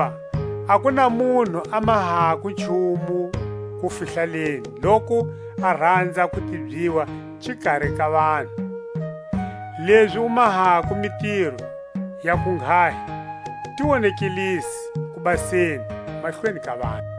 Hakuva a ku na munhu a mahako nchumu kufihlaleni loku a ranza ku tibyiwa xikari ka vanhu. Lezi u mahako mitiro ya kunghahi ti wonekelise kubaseni mahlweni ka vanhu.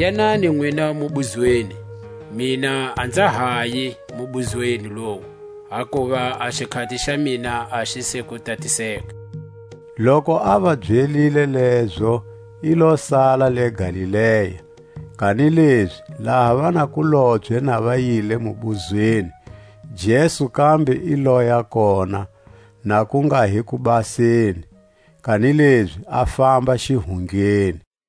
Yanani nwina mubuzweni, mina a nza hayi mubuzweni lowu; hakuva a xikhati xa mina a xi se ku tatiseka. Loku a va byelile lezo, i lo sala le Galilea. Kanilezi laha vanakulobye na va yile mubuzweni, Jesu kambe i loya kona, na ku nga hi kubaseni, kanilezi a famba xihundleni.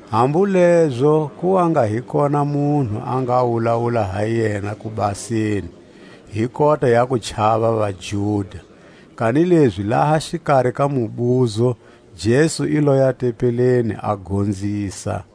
Hambu lezo ku wa nga hi kona munhu a nga wulawula ha yena kubaseni, hi kota ya kuchava vaJuda. Kanilezi laha xikari ka mubuzo Jesu i loya tempeleni, a gonzisa.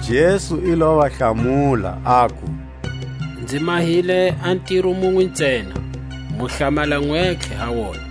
Jesu i lo va hlamula, aku: Nzi mahile a ntiro munwe ntsena, mu hlamala nwentlhe ha wona.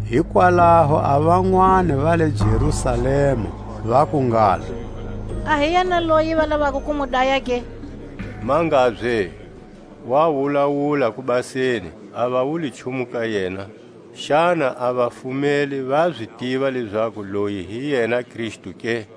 Hikwalaho a vanwani va le Jerusalema vaku ngalo: A hi yena loyi va lavako ku mu daya ke? Mangabye, wa wulawula kubaseni, a ya wuli nchumu ka yena. Xana a vafumeli va zi tiva lezaku loyi hi yena Kristu ke?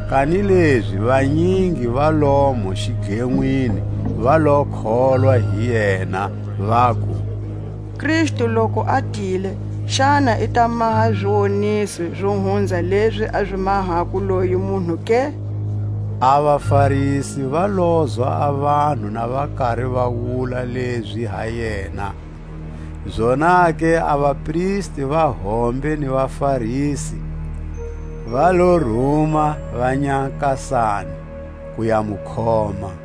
Kanilezi vanyingi va lomo xidlenwini va lo kholwa hi yena, vaku: Kristu loku a tile, xana i ta maha ziwoniso Zo hunza lezi a zi mahako loyi munhu ke? A vaFarisi va lozwa a vanhu na va kari va wula lezi ha yena; zonake a vapristi va hombe ni vaFarisi va lo ruma vanyakasani ku ya mu khoma.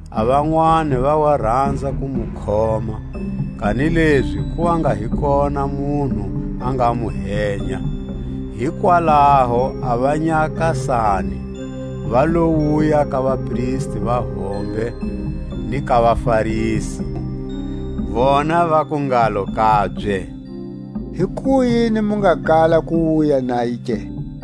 A vanwani va wa ranza ku mu khoma, kanilezi ku wa nga hi kona munhu a nga mu henya. Hikwalaho a vanyakasani va lo wuya ka vapristi va hombe ni ka vaFarisi; vona vaku ngalo kabye: Hikuyini mu nga kala ku wuya naye ke?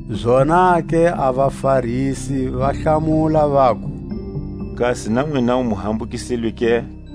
Zonake a vaFarisi va hlamula, vaku: Kasi na nwinawu mu hambukisilwe ke?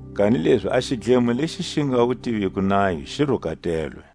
Kanilezi a xidlemo lexi xi nga wu tiviko nayo, xi rukatelwe.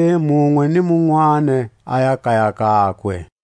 Zonake munwe ni munwani aya kaya kakwe.